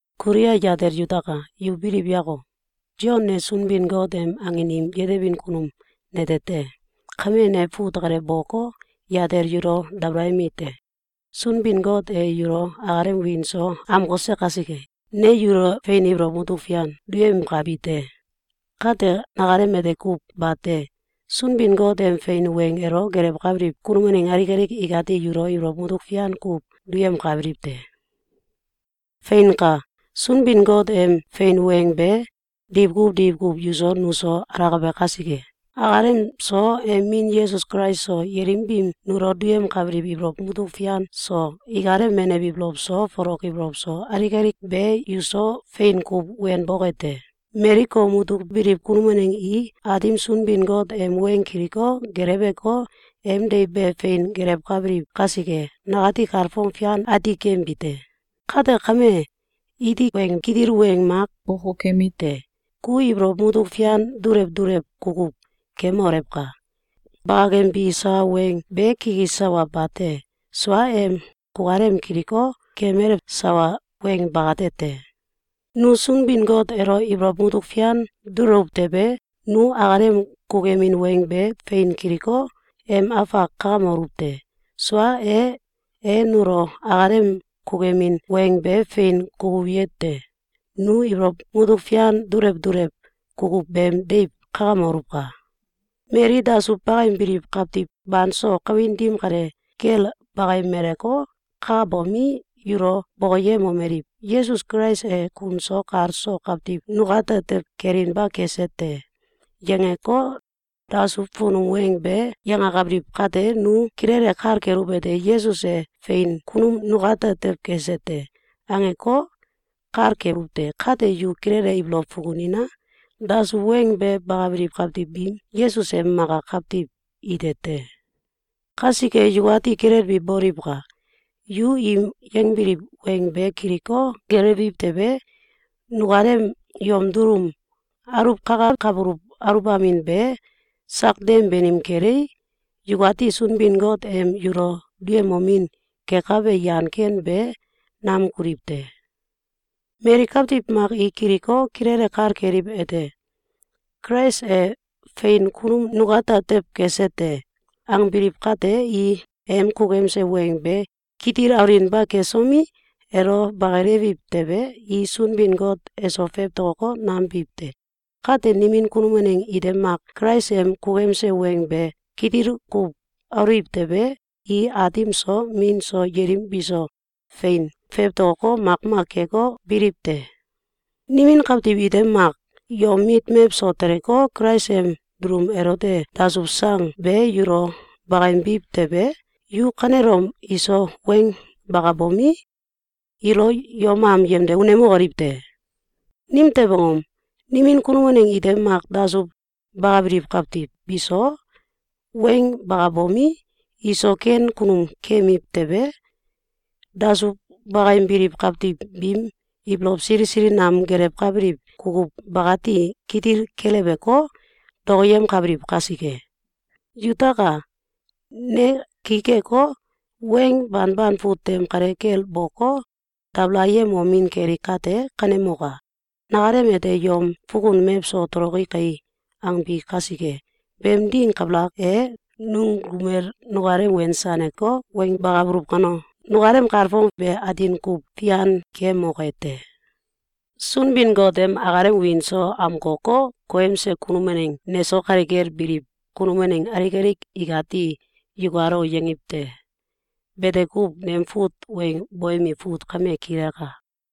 Kulia yatel yutaka! Yu biliw yako! Sion ne Sunbin-Got em angin im yetebin kunum nete te. Kame, ne fut kale boko, yatel yulo, dabalayemi te. Sunbin-Got e yulo akalem wiin so amkose kasike, ne yulo fein ibolow mutuk fian duyemkabi te. Kate, nakalem ete kuw bate! Sunbin-Got em fein weng elo gelewkabiliw kunum waneng alik alik ikati yulo ibolow mutuk fian kuw duyemkabiliw te. Feinka! Sunbin-Got em fein weng be diwkuw diwkuw yuso nuso alakabe kasike, akalem so, em min Yesus Kulais so, yelim biim nulo duyemkabiliw ibolow mutuk fian so, ikalem menew ibolow so, folok ibolow so, alik alik be yuso fein kuw wenboke te. Mali kom mutuk biliw kunum waneng i Aatim Sunbin-Got em weng kiliko, geleweko, em deiw be fein gelewkabiliw kasike, nakati kalfong fian ati keyembi te. Kate kame, iti weng kitil weng mak bokokemite: Ku ibolow mutuk fian dulew dulew kukuw kemolewka! Bakakembi sawa weng be kikis sawa bate! Sua em kukalem kiliko, kemalew sawa weng bakate te. Nu Sunbin-Got elo ibolow mutuk fian dulewuw tewe, nu akalem kukuyemin weng be fein kiliko, em afak kakamokoluw te. Sua e, e nulo akalem kukuyemin weng be fein kukuyete: Nu ibolow mutuk fian dulew dulew kukuw beem deiw kakamoluwka! Mali dasuw bakayembiliw kawtiw banso kawin dim kale kel bayemeleko, kakabomi, yulo bokoyemomeliw: “Yesus Kulais e kun so kal so kawtiw nukate tew kelinba kese te!”, yangeko, dasuw funum weng be yangakabiliw kate, nu kilele kal keluwete: “Yesus e fein kunum nukate tew kese te!”, angeko, kal keluw te. Kate yu kilele ibolow fukunina! Dasuw weng be bakabiliw kawtiw bi Yesus em maka kawtiw ite te. Kasike yukati kilelbi boliwka! Yu im yangbiliw weng be kiliko, gelewiw tewe, nukalem yom dulum aluwkakawkabuluw aluwbamin be sak dem banim kelei, yukati Sunbin-Got em yulo duyemomin kekabe yan ken be nam kuliw te. Mali kawtiw mak i kiliko, kilele kal keliwete: “Kulais e fein kunum nukate tew kese te!”, angbiliw kate, i em kukuyemse weng be kitil aluwinba kesomi, elo bakilewiw tewe, i Sunbin-Got eso fewtokoko, nam biw te. Kate nimin kunum waneng ite mak Kulais em kukuyemse weng be kitil kuw aluwiw tewe, i Aatim so, Min so, yelim biso fein fewtokoko, makmak keko, biliw te. Nimin kawtiw ite mak yom mit mewso teleko, Kulais em dulum elote dasuw sang be yulo bakayembiw tewe, yu kanelom iso weng bakabomi, ilo yom am yemde unemokoliw te! Nimtew angom? Nimin kunum waneng ite mak dasuw bakabiliw kawtiw biso weng bakabomi, iso ken kunum keyemiw tewe, dasuw bakayembiliw kawtiw biim ibolow sili sili nam gelewkabiliw kukuw bakati kitil keleweko, dokoyemkabiliw kasike. Yutaka! Ne ki keko, weng banban fut tem kale kel boko, dabalayemomin keli kate, kanemoka! Nakalem ete “Yom fukun mewso toloki kai!”, angbi kasike. Beem ding kabalak e, nungumel nukalem wensaneko, weng bakabuluw kano, nukalem kalfong be atin kuw fian keyemoke te. Sunbin-Got em akalem wiin so amkoko, koyemse kunum waneng neso kale kel biliw kunum waneng alik alik ikati “Yukalo!”, yangiw te. Bete kuw. Nem fut weng boyemi fut kame kilaka.